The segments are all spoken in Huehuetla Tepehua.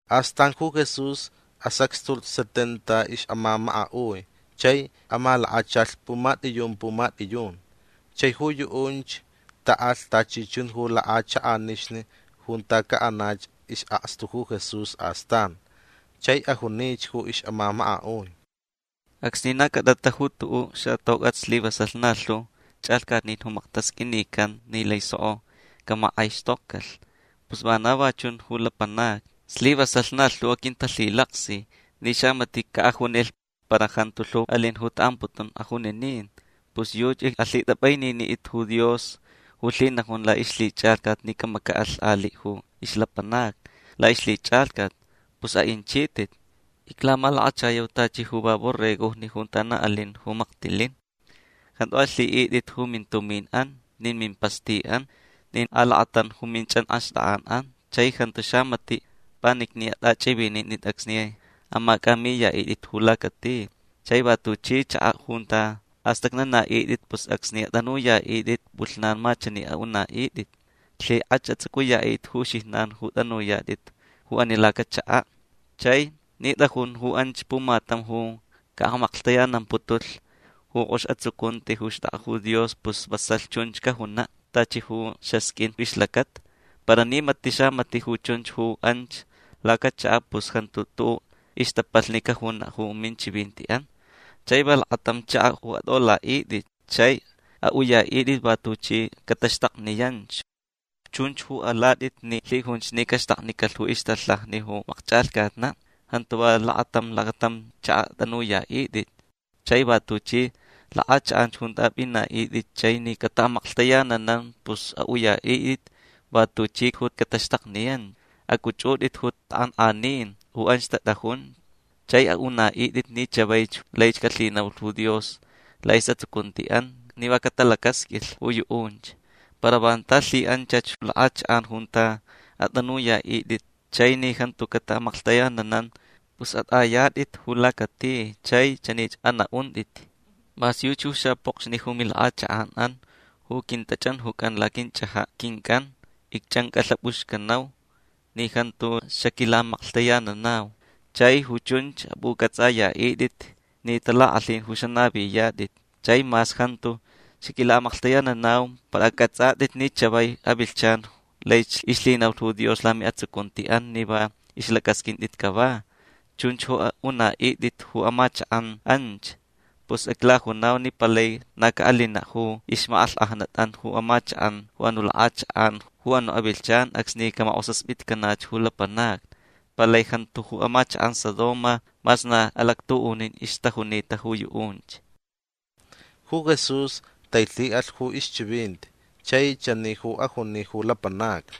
Astan ju Jesús asacxtulh setenta ixʼamamakaʼui chai amalakachalh pumatʼiyun pumatʼiyun. Chai ju yuʼunch taʼalh tachi chun ju lakʼachakʼanixni junta caʼanach isʼakstu ju Jesús astan. Chai ajunich ju ixʼamamakaʼui: ―Acsni na cʼatʼata ju tuʼuʼ xatocʼat slivasalh na lhu chʼalhcatnin ju maktasqʼuinican ni laich soko camakʼaixtokcalh. Pus vana va chun ju lapanacni. Slivasalh na lhu ju aquintalhilaksi ni xamatiʼ caʼajunilh. Para jantu lhu alin ju taʼamputun ajuninin. Pus yuchi alhitʼapʼaininitʼit ju Dios ju lhinajun laʼixlhichʼalhcat ni camacaʼalh aliʼ ju ixlapanacni laʼixlhichʼalhcat. Pus aʼinchitʼit. Iclamalakachayau tachi ju va borregojni junta na alin ju maktilin. Jantu alhiʼitʼit ju mintuminʼan nin mimpastiʼan nin alakatam ju minchʼanxtakʼanʼan. Chai jantu xamatiʼ panicni atʼachʼivinintʼit acsni amacʼamiyaʼitʼit ju lacati. Chai va tuchi chakaʼ junta astʼacnanaʼitʼit pus acsni atʼanuyaʼitʼit pʼulhnan ma chani anaʼuntʼit: “Lhikʼach atsʼucʼuyaʼitʼit ju uxijnan ju tʼanuyatʼit ju ani lacachakaʼ”. Chai ni tʼajun ju anch pumatam ju caʼamaklhtayanamputulh ju kʼox atsucunti ju xtʼakʼa ju Dios pus vasalh chunch cajunaʼ tachi ju xasqʼuin ixlacata. Para ni matiʼ xamatiʼ ju chunch ju anch lacachakaʼ pus jantu tuʼuʼ ixtapalhni cajunaʼ ju minchivintiʼan. Chai va lakatam chakaʼ ju atʼolaʼitʼit. Chai aʼuyaʼitʼit va tuchi cataxtakniyanch. Chunch ju alatʼit ni lhijunch ni caxtaknicalh ju ixtalhaja ju makchʼalhcatnaʼ. Jantu lakatam lakatam chakaʼ atʼanuyaʼitʼit. Chai va tuchi lakʼachakʼan junta apʼinaʼitʼit chai ni cataʼamaklhtayananan pus aʼuyaʼitʼit va tuchi ju cataxtakniyan. Acʼuchʼutʼit ju takʼankʼanin ju anch tatʼajun. Chai aʼunaʼitʼit ni chavaich laich calhinaulh ju Dios laʼisʼatsucuntiʼan ni va catalacasqʼuilh ju yuʼunch. Para vanta lhiʼanchach lakʼachakʼan junta atʼanuyaʼitʼit chai ni jantu cataʼamaklhtayananan pus atʼayatʼit ju lacati chai chanich anaʼuntʼit: “Mas yuchi ju xapokxni ju milakʼachakʼanʼan ju quintachʼanjucan laquinchʼajaʼ quincʼan icchʼancʼalhapʼuxcanau ni jantu xaquilaʼamaklhtayananau. Chai ju chunch apʼucʼatsʼayaʼitʼit ni talakʼalhin ju xanaviyatʼit. Chai mas jantu xaquilaʼamaklhtayananau para acʼatsʼatʼit ni chavai avilhchan laich ixlhinaulh ju Dios lamiʼatsucuntiʼan ni va ixlacʼasqʼuintʼit cava”. Chunch ju aʼunaʼitʼit ju amachakʼan anch. Pus iclajunau ni palai na caʼalinaʼ ju ixmakʼalhkʼajnatʼan ju amachakʼan ju anuʼ lakʼachakʼan ju anuʼ avilhchan acsni camakʼosaspitcanach ju lapanacni. Palai jantu ju amachakʼan Sodoma mas na alactuʼunin ixtajunita ju yuʼunch. Ju Jesús tailhiʼalh ju ixchivinti chai chani ju ajuni ju lapanacni: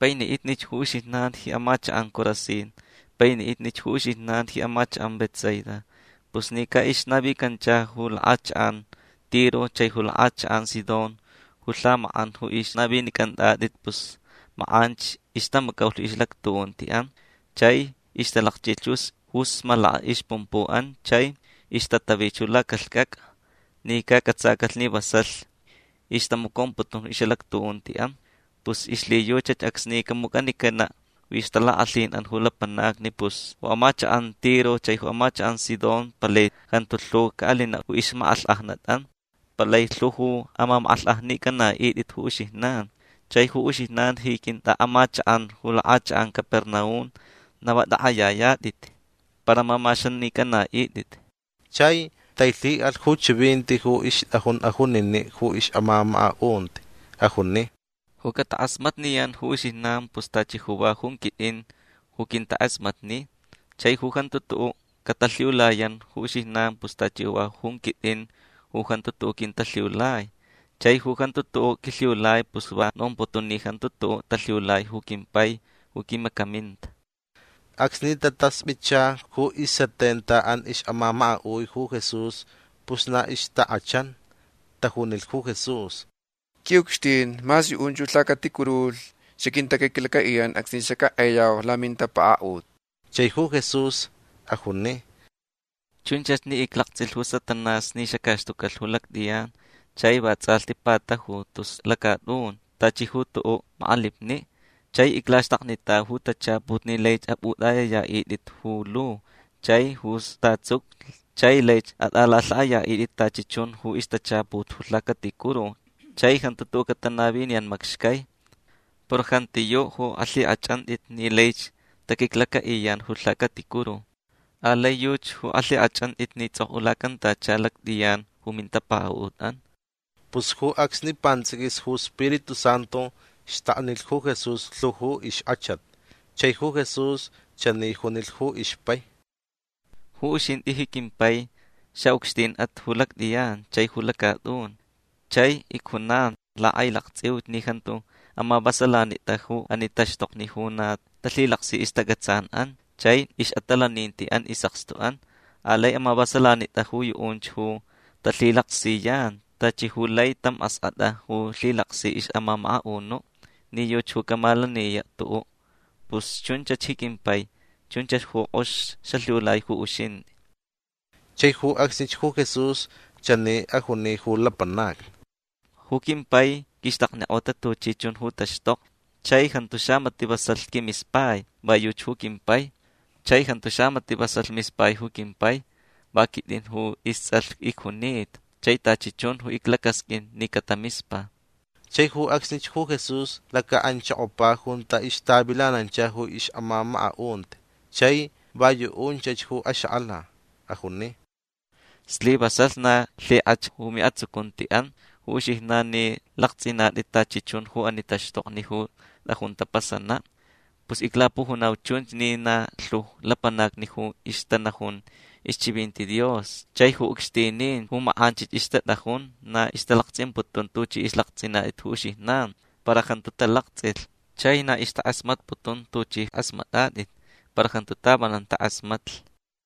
―Painiʼitnich ju uxijnan ji amachakʼan Corazín. Painiʼitnich ju uxijnan ji amachakʼan Betsaida. Pus ni caʼixnavicancha ju lakʼachakʼan Tiro chai ju lakʼachakʼan Sidón ju lhamakʼan ju ixnavinicʼantʼatʼit pus makʼanch ixtamacaulh ixʼalactuʼuntiʼan chai ixtalakchʼilh ju smalaka ixpumpuʼan chai ixtatavi lacalhcʼacʼa ni cacʼatsacalh ni vasalh ixtamacomputun ixʼalactuʼuntiʼan. Pus ixlhiyuchach acsni camucʼanicanaʼ ju ixtalakʼalhinʼan ju lapanacni pus ju amachakʼan Tiro chai ju amachakʼan Sidón palai jantu lhu caʼalinaʼ ju ixmakʼalhkʼajnatʼan. Palai lhu ju amamakʼalhkʼajnicʼanaʼitʼit ju uxijnan. Chai ju uxijnan ji quintʼaʼamachakʼan ju lakʼachakʼan Capernaum na va tʼakʼayayatʼit. Para amamaxanicʼanaʼitʼit. Chai tailhiʼalh ju chivinti ju ixtʼajun ajuniniʼ ju ixʼamamakaʼunti. Ajuni: ―Ju catakʼasmatniyan ju uxijnan pus tachi ju va jun quitʼin ju quintakʼasmatni. Chai ju jantu tuʼuʼ catalhiulayan ju uxijnan pus tachi ju va jun quitʼin ju jantu tuʼuʼ quintalhiulai. Chai ju jantu tuʼuʼ quilhiulai pus va nomputun ni jantu tuʼuʼ talhiulai ju quimpai ju quimacaminta. Acsni tataspʼitcha ju isetentaʼan ixʼamamakaʼui ju Jesús pus na ixtakʼachan. Tajunilh ju Jesús: ―Quiʼucxtin mas yuʼunch ju lhacaticurulhni xaquintaquiclacaʼiyan acsni xackʼayau lamintapakaʼut. Chai ju Jesús ajuni: ―Chunchach ni iclaktsʼilh ju Satanás ni xacaxtucalh ju lactʼiyan chai vatsʼalhti patajulh tus lacatʼun tachi ju tuʼuʼ makʼalipniʼ. Chai iclaxtaknitau ju tachaput ni laich apʼutʼayayaʼitʼit ju lu chai ju statsucu chai laich atʼalalhaʼayaʼitʼit tachi chun ju ixtachaput ju lhacaticuru chai jantu tuʼuʼ catanaviniyan macxcai. Para jantiyuʼ ju alhikʼachʼantʼit ni laich taquiclacaʼiyan ju lhacaticuru. Alai yuchi ju alhikʼachʼantʼit ni tsʼokʼulacantacha lactʼiyan ju mintapakaʼutʼan. Pus ju acsni pantsʼiquis ju Spiritu Santu xtaknilh ju Jesús lhu ju ixkʼachat. Chai ju Jesús chani junilh ju ixpai: ―Ju uxintʼi ji quimpai xaʼucxtinʼat ju lactʼiyan chai ju lacatʼun. Chai icjunan lakʼailaktsʼiuch ni jantu amavasalanitʼa ju ani taxtokni ju na talhilaksi ixtacʼatsanʼan chai ixʼatalanintiʼan isʼakstuʼan. Alai amavasalanitʼa ju yuʼunch ju talhilaksiyan tachi ju lai tam askʼatʼa ju lhilaksi ixʼamamakaʼunuʼ ni yuchi ju camalaniyaʼ tuʼuʼ. Pus chunchach ji quimpai. Chunchach ju kʼox xalhiulai ju uxintʼi. Chai ju acsnich ju Jesús chani ajuni ju lapanacni: ―Ju quimpai quixtaknikʼota tachi chun ju taxtokni. Chai jantu xamatiʼ vasalh quimispai. Va yuchi ju quimpai. Chai jantu xamatiʼ vasalh mispai ju quimpai. Va quitʼin ju istsʼalh icjunita chai tachi chun ju iclacasqʼuin ni catamispa. Chai ju acsnich ju Jesús lacaʼanchokopa junta ixtavilanancha ju ixʼamamakaʼunti chai va yuʼunchach ju axakʼala. Ajuni: ―Slivasalh na lhikʼach ju miʼatsucuntiʼan ju uxijnan ni laktsʼinatʼit tachi chun ju ani taxtokni ju tʼajun tapasanaʼ. Pus iclapujunau chunch ni na lhu ju lapanacni ju ixtanajun ixchivinti Dios chai ju ucxtinin ju makʼanchich ixtatʼajun na ixtalaktsʼimputun ju tuchʼi laktsʼinatʼit ju uxijnan. Para jantu talaktsʼilh. Chai na ixtakʼasmatputun tuchʼi kʼasmatʼatʼit. Para jantu tavanan takʼasmatlh.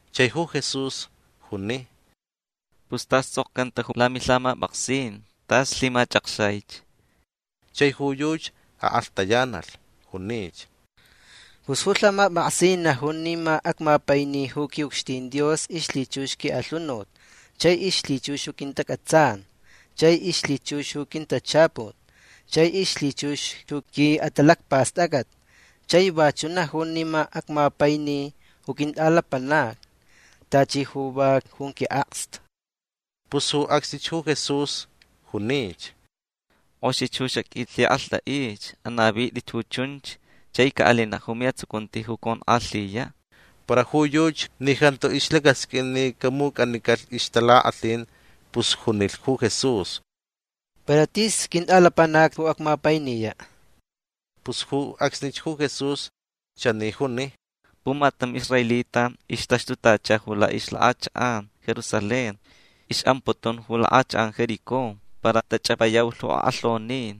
Chai ju Jesús juni: ―Pus tas tsʼokcanta ju lamilhamapʼaksin. Tas lhimachʼakxaich. Chai ju yuchi akʼalhtayanalh. Junich: ―Pus ju lhamapʼaksin najun ni ma acmapaini ju quiʼucxtin Dios ixlhichux quiʼalhunut chai ixlhichux ju quintacʼatsan chai ixlhichux ju quintachaput chai ixlhichux ju quiʼatalacpastʼacʼat. Chai vachuʼ najun ni ma acmapaini ju quintʼalapanac tachi ju va jun quiʼakstu. Pus ju acsnich ju Jesús junich: ―Kʼoxich ju xaqʼuilhikʼalhtʼaich. Anavitʼi ju chunch chai caʼalinaʼ ju miʼatsucunti ju conkʼalhiyaʼ. Para ju yuchi ni jantu ixlacasqʼuin ni camucʼanicalh ixtalakʼalhin pus junilh ju Jesús: ―Para tis quintʼalapanac ju acmapainiyaʼ. Pus ju acsnich ju Jesús chani juni: ―Pumatam israelita ixtaxtutacha ju lakʼachakʼan Jerusalén. Ixʼamputun ju lakʼachakʼan Jericó. Para tachʼapayaulh ju akʼalhonin.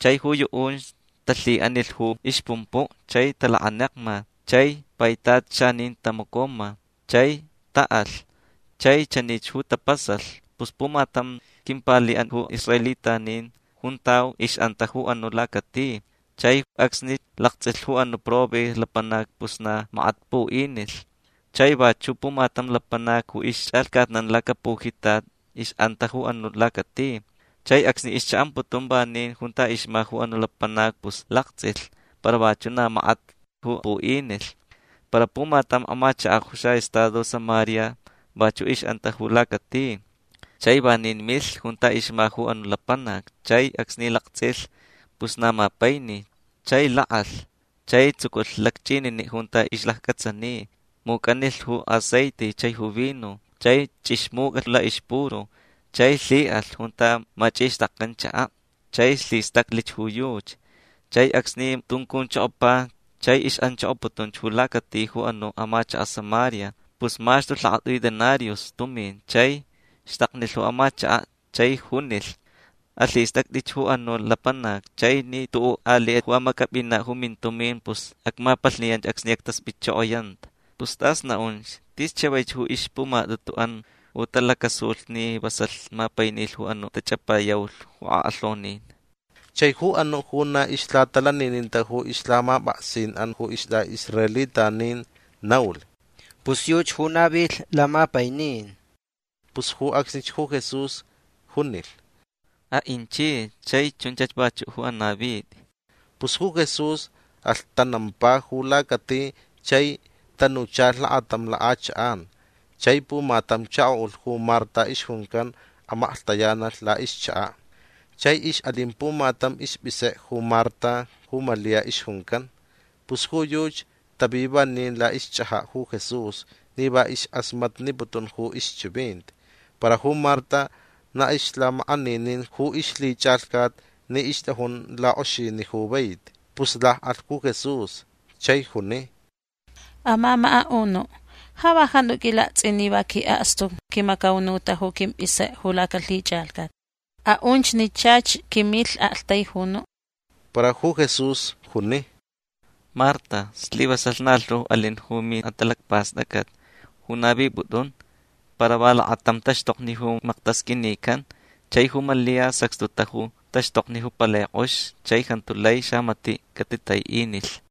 Chai ju yuʼunch talhiʼanilh ju ixpumpuʼ chai talakanekma. Chai paitat xanin tamacoma. Chai taʼalh. Chai chanich ju tapasalh. Pus pumatam quimpaliʼan ju israelitanin juntau ixʼanta ju anuʼ lacati. Chai acsni laktsʼilh ju anuʼ probe lapanac pus na makat puʼinilh. Chai vachuʼ pumatam lapanac ju ixchʼalhcatnan lacpujitat ixʼanta ju anuʼ lacati. Chai acsni ixchaʼamputun vanin junta ixma ju anuʼ lapanac pus laktsʼilh para vachuʼ na makat ju puʼinilh. Para pumatam amachakaʼ ju xaʼestado Samaria vachuʼ ixʼanta ju lacati. Chai vanin milh junta ixma ju anuʼ lapanac. Chai acsni laktsʼilh pus na mapaini. Chai lakʼalh. Chai tsuculh lacchʼininiʼ junta ixlacacʼatsani. Mucʼanilh ju aceite chai ju vino. Chai chʼixmucʼalh laʼixpuru. Chai lhiʼalh junta machʼixtakcan chakaʼ. Chai lhistaclh ju yuchi. Chai acsni tuncunchokopa chai ixʼanchokoputun ju lacati ju anuʼ amachakaʼ Samaria pus maxtulh lakatʼui denarius tumin. Chai xtaknilh ju amachakaʼ chai junilh: “Alhistʼactʼi ju anuʼ lapanac. Chai ni tuʼuʼ aliʼ ju amacʼapʼinaʼ ju mintumin pus acmapalhniyanch acsni actaspʼitchokoyanta”. Pus tʼas naʼunch. Tis chavaich ju ixpumatʼutuʼan ju talacasulh ni vasalh mapainilh ju anuʼ tachʼapayaulh ju akʼalhonin. Chai ju anuʼ ju na ixlhatalanininta ju ixlhamapʼaksinʼan ju istʼaʼisraelitanin naulh: ―Pus yuchi ju navilh lamapainin. Pus ju acsnich ju Jesús junilh: ―Aʼinchich chai chunchach vachuʼ ju anavitʼi. Pus ju Jesús alhtanampa ju lacati chai tanuchalh lakatam lakʼachakʼan. Chai pumatam chakoʼulh ju Marta ixjuncan amaklhtayanalh laʼixchakaʼ. Chai ixʼalin pumatam ispʼisekʼe ju Marta ju Malia ixjuncan. Pus ju yuchi tavi vanin laʼixchʼajaʼ ju Jesús ni va ixkʼasmatniputun ju ixchivinti. Para ju Marta na ixlhamakʼaninin ju ixlhichʼalhcat ni ixtʼajun lakʼoxiniʼ ju vaiti. Pus lakʼalh ju Jesús chai juni: ―Amamakaʼunuʼ ja va jantu qʼuilaktsʼin ni va quiʼakstu quimacaunuta ju quimpʼisekʼe ju lacalhichʼalhcat. Aʼunch ni chach quimilh aktaijunuʼ. Para ju Jesús juni: ―Marta slivasalh na lhu alin ju miʼatalacpastʼacʼat ju navipʼutʼun. Para va lakatam taxtokni ju maktasqʼuinican. Chai ju Malia sacxtuta ju taxtokni ju palai kʼox chai jantu lai xamatiʼ catitaiʼinilh.